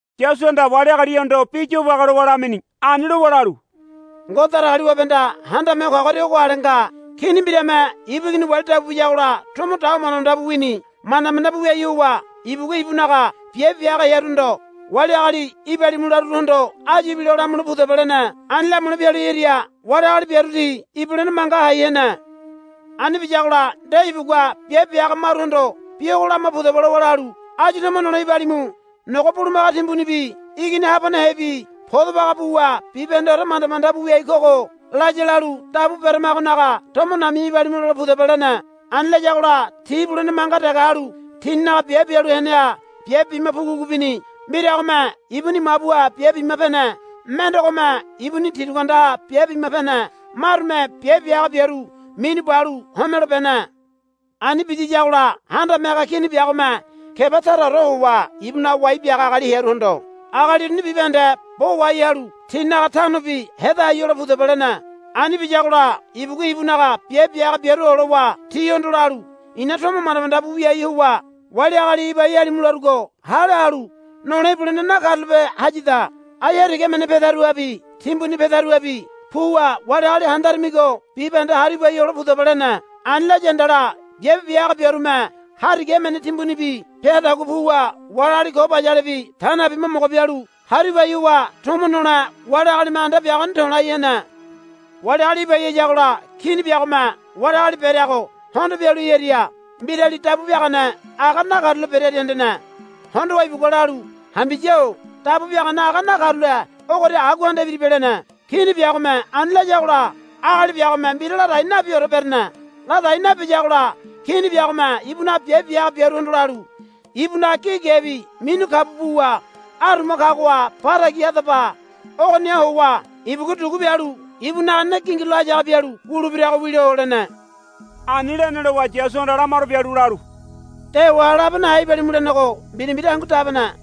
Yasuhanda wali agalihondo bi yobage lowa lamini. Ani lowa lalu, Ngode Datagaliwabehanda Handame Ho Kagoria ogo ale nga. Kini mbirame ibu igini wali dabu biyagola tomo dawa manda manda bu wini. Manda manda bu wiai howa ibugua ibunaga biabe bia haga hearuhondo, Wali agali ibalimu laruruhondo áyu ibilo lamule pudaba, lene. Ani lamule pialu hearia wali agali biaru ti ibulene manga hai hene. Ani biyagola nde ibugua biabe bia haga maruhondo, Bi ogo lama pudaba, lowa lalu, Áyu tomo nole ibalimu. Nogo bulumaga timbunibi igini habanehebi podo baga buwa bibahendeore manda manda bu wiai kogo, laya lalu dabu beramagonaga tomo nami̱ya ibalimu lole pudaba, lene. Ani layagola ti ibulene manga dege halu tininaga biabe bialu heneha biabe bima pugu pugu bini. Mbiragome ibuni mabuha biabe bima pene. Mendegome ibuni tirugu andaha biabe bima pene. Marume biabe bia haga biaru minu balu homelo bene. Ani biyiyagola handame haga kini biagome keba taraore howa ibunaga wai biaga agali hearuhondo, Agali uruni bibahende bo wahai halu tinaga tanobi heda hai hole pudaba, lene. Ani biyagola ibugua ibunaga biabe bia haga biaru olowa tihondo lalu, I̱na tomo manda manda bu wiai howa wali agali ibai halimu larugo hale halu nole ibulene nakarulape hayada. Ai hariga emene pedaruhabi timbuni pedaruhabi puwa wali agali handaramigo bibahende haru ibai hole pudaba, lene. Ani laya handala biabe bia haga biarume hariga emene timbunibi peadagua puwa wali agali ko bayalebi ta nabi mo mogo bialu haru ibai howa tomo nole wali agalime anda biagoni to̱lai hene. Wali agali ibai hayagola kini biagome wali agali bereago hondo pialu hearia mbirali dabu biagane aga nakarule berearia hendene. Hondowa ibugua lalu, Hambiya-o dabu biagane aga nakarule ogoria agua anda ibiribe, lene. Kini biagome ani layagola agali biagome mbira ladai nabiore berene. Ladai nabiyagola kini biagome ibunaga biabe bia haga biaruhondo lalu, Ibunaga gi gebi minu kabu buwa aruma kagoha ba tagi hadaba. Ogoniha howa ibugua dugu bialu ibunaga ne gingirulo hayaga bialu wulebirago wilo, lene. Ani lene lowa Yasuhanda lamaro bialu lalu, Dewa labe nahe ibalimu lenego mbira mbira hangu dabene,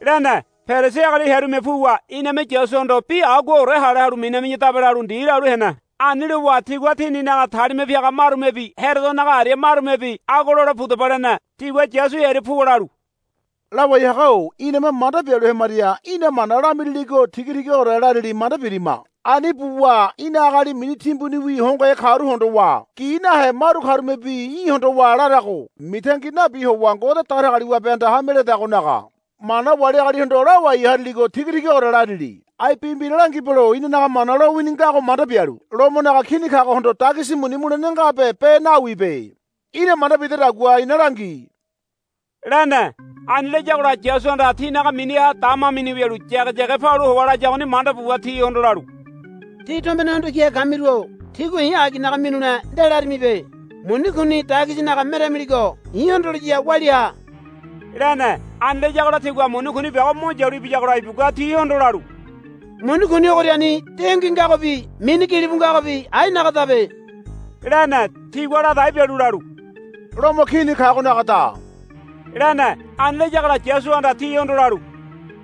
lene. Perisi agali hearume puwa, Iname Yasuhondo bi aguaore hale halu minami̱yadabe, lalu ndi lalu hene. Ani lowa tigua tininaga talima piaga marumebi Herodonaga aria marumebi, Agua lole pudaba, lene. Tigua Yasu hearia puwa lalu, Lawai haga-o iname manda bialu hemaria í̠na mana lamiriligo tiga tigaore larili manda birima. Ani buwa í̠na agali mini timbuniwi hongohe karu hondowa gi nahe maru karumebi í̠ hondowa larago mitangi nabi howa Ngode Datagaliwabehanda hame ledagonaga mana wali agalihondo lawai hariligo tiga tigaore larili. Ai bi mbira langibelo inanaga Mana lowini ngago manda bialu Lomonaga Kini kagohondo dagisi muni mulene ngabe be nawibe. Í̠na manda bidedagua ina langi, lene. Ani layagola Yasuhanda tinaga miniha dama mini wialu yageyage palu howa layagoni manda buwa tihondo lalu, Tí tombene hondo kihe kamiru-o tígua i̱ aginaga minule nde larimibe. Muni kuni dagisinaga meramiligo i̱ hondoliya walia ha, lene. Ani layagola tigua muni kuni biago mo yalu ibiyagola ibugua tihondo lalu, Muni kuni ogoriani dengui ngagobi mini gilibu ngagobi ainagadabe, lene. Tigua ladai bialu lalu, Lomo Kini kagonagada, lene. Ani layagola Yasuhanda tihondo lalu,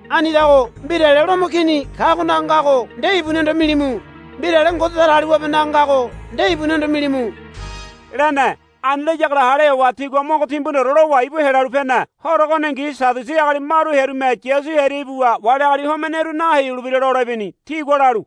Anidago mbirale Lomo Kini kagonaga ngago nde ibunihondo milimu. Mbirale Ngode Datagaliwabenaga ngago nde ibunihondo milimu, lene. Ani layagola hale howa tigua mogo timbuniore lowa ibu helalu pene. Horo ogoningi Sadiusi agali maru hearume Yasu hearia ibuwa wali agali homeneyaru naheyulebira lole ibini. Tigua lalu,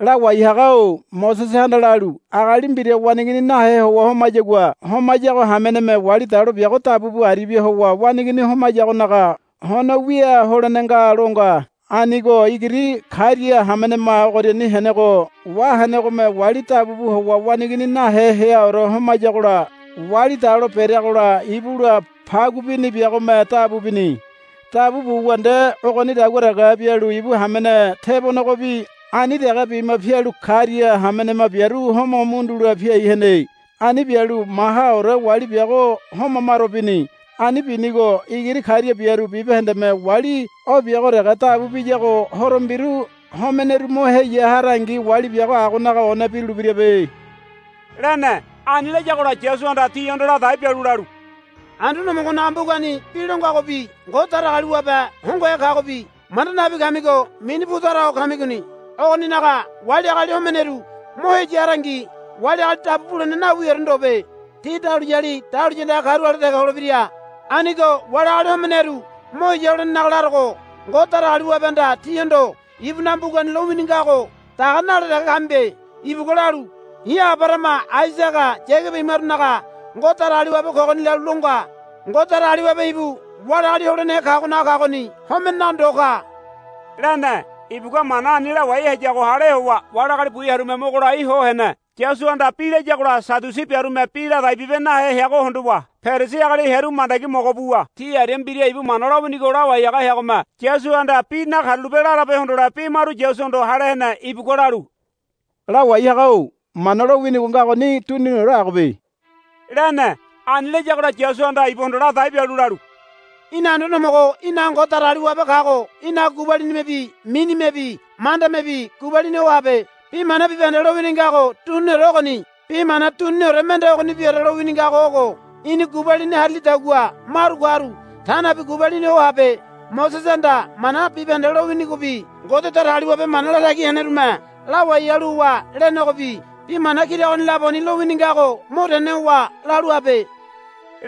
Lawai haga-o Mosesehanda lalu, Agali mbira waneigini nahe howa homayagua homayago hameneme wali dalo biago dabu bu aribia howa waneigini homayagonaga hono wia holene nga, lo nga. Anigo igiri karia hamenema ogoriani henego wahenegome wali dabu bu howa waneigini nahe heaore homayagola wali dalo bereagola ibula pagu bini biagome dabu bini. Dabu buwa nde ogonidagua dege bialu ibu hamene tebonegobi ani dege bima pialu karia hamenema biaru homo mundula piai hene. Ani bialu mahaore wali biago homa maro bini. Ani binigo igiri karia biaru bibahendeme wali o biago dege dabu biyago horo mbiru homeneru mo heya harangi wali biago agonaga one birulebirabe, lene. Ani layagola Yasuhanda tihondo ladai bialu lalu, Anduane Homogonaga mbugani bi lo ngagobi Ngode Datagaliwabe hongohe kagobi manda nabi kamigo mini pu tara ho kamigoni. Ogoninaga wali agali homeneru mo heya harangi wali agali dabu bulene nawiore ndobe. Ti dahuliyali dahuliya andaga karu ale dege holebira. Anigo wali agali homeneru mo heya holenenaga larogo Ngode Datagaliwabehanda tíhondo ibunaga mbugani lowini ngago daga nale dege kamibe. Ibugua lalu, I̱ Abarahama Aisaga Yagaba imarunaga Ngode Datagaliwabe kogoni, lalu lo nga. Ngode Datagaliwabe ibu wali agali holenehe kagonaga kagoni homenenaga ndo ka, lene. Ibugua mana ani lawai hayago hale howa wali agali bu hearume mogo lai ho hene. Yasuhanda bi layagola Sadiusi biarume bi ladai bibe nahe heago hondowa Perisi agali hearu mandagi mogo buwa ti aria mbira ibu Mana lowinigo lawai haga heagome Yasuhanda bi nakarulape larabe hondole bi maru Yasuhondo hale hene. Ibugua lalu, Lawai haga-o Mana lowinigo ngagoni duniniore agobe, lene. Ani layagola Yasuhanda ibuhondo ladai bialu lalu, Í̠na Anduane Homogo í̠naga Ngode Datagaliwabe kago í̠naga gubalinimebi minimebi mandamebi gubalini ho habe. Bi mana bibahende lowini ngago duniniore ogoni. Bi mana duniniore mende ogonibiore lowini ngago ogo, Í̠ni gubalini harilidagua maru karu ta nabi gubalini ho habe. Mosesehanda Mana bibahende lowinigobi Ngode Datagaliwabe mana latagi henerume lawai halu howa lenegobi bi mana kira ogoni laboni lowini ngago mo tene howa lalu habe,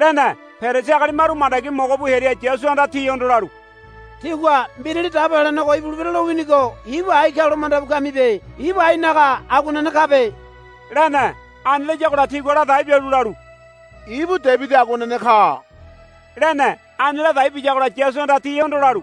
lene. Perisi agali maru mandagi mogo bu hearia Yasuhanda tihondo lalu, Tígua Mbirali Dabo Helenego ibulebira lowinigo ibu ai kalo manda bu kamibe. Ibu ainaga aguanene kabe, lene. Ani layagola tigua ladai bialu lalu, Ibu Debidi aguanene ka, lene. Ani ladai biyagola Yasuhanda tihondo lalu,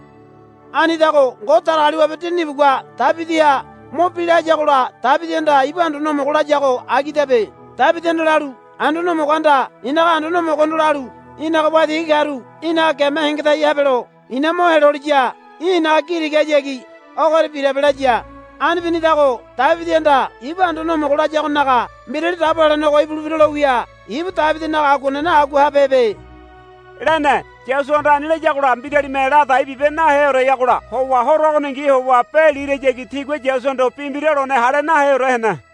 Anidago Ngode Datagaliwabe Dinini ibugua Debidiha mo bila hayagola Debidihanda ibu Anduane Homogo layago agidabe. Debidihanda lalu, Anduane Homogohanda i̱naga Anduane Homogohondo lalu, Í̠naga waitigi karu í̠naga geme hengedai habelo i̱na mo heloliya í̠ i̱naga gi tigahayagi ogoria birabe, laya. Ani binidago Debidihanda ibu Anduane Homogo layagonaga Mbirali Dabo Helenego ibulebira lo wia ibu Debidinaga aguanene agua habehebe, lene. Yasuhanda ani layagola mbiralime ladai bibe naheoreyagola howa horo ogoningi howa be lirayagi tigua Yasuhondo bi mbira lone hale naheore hene.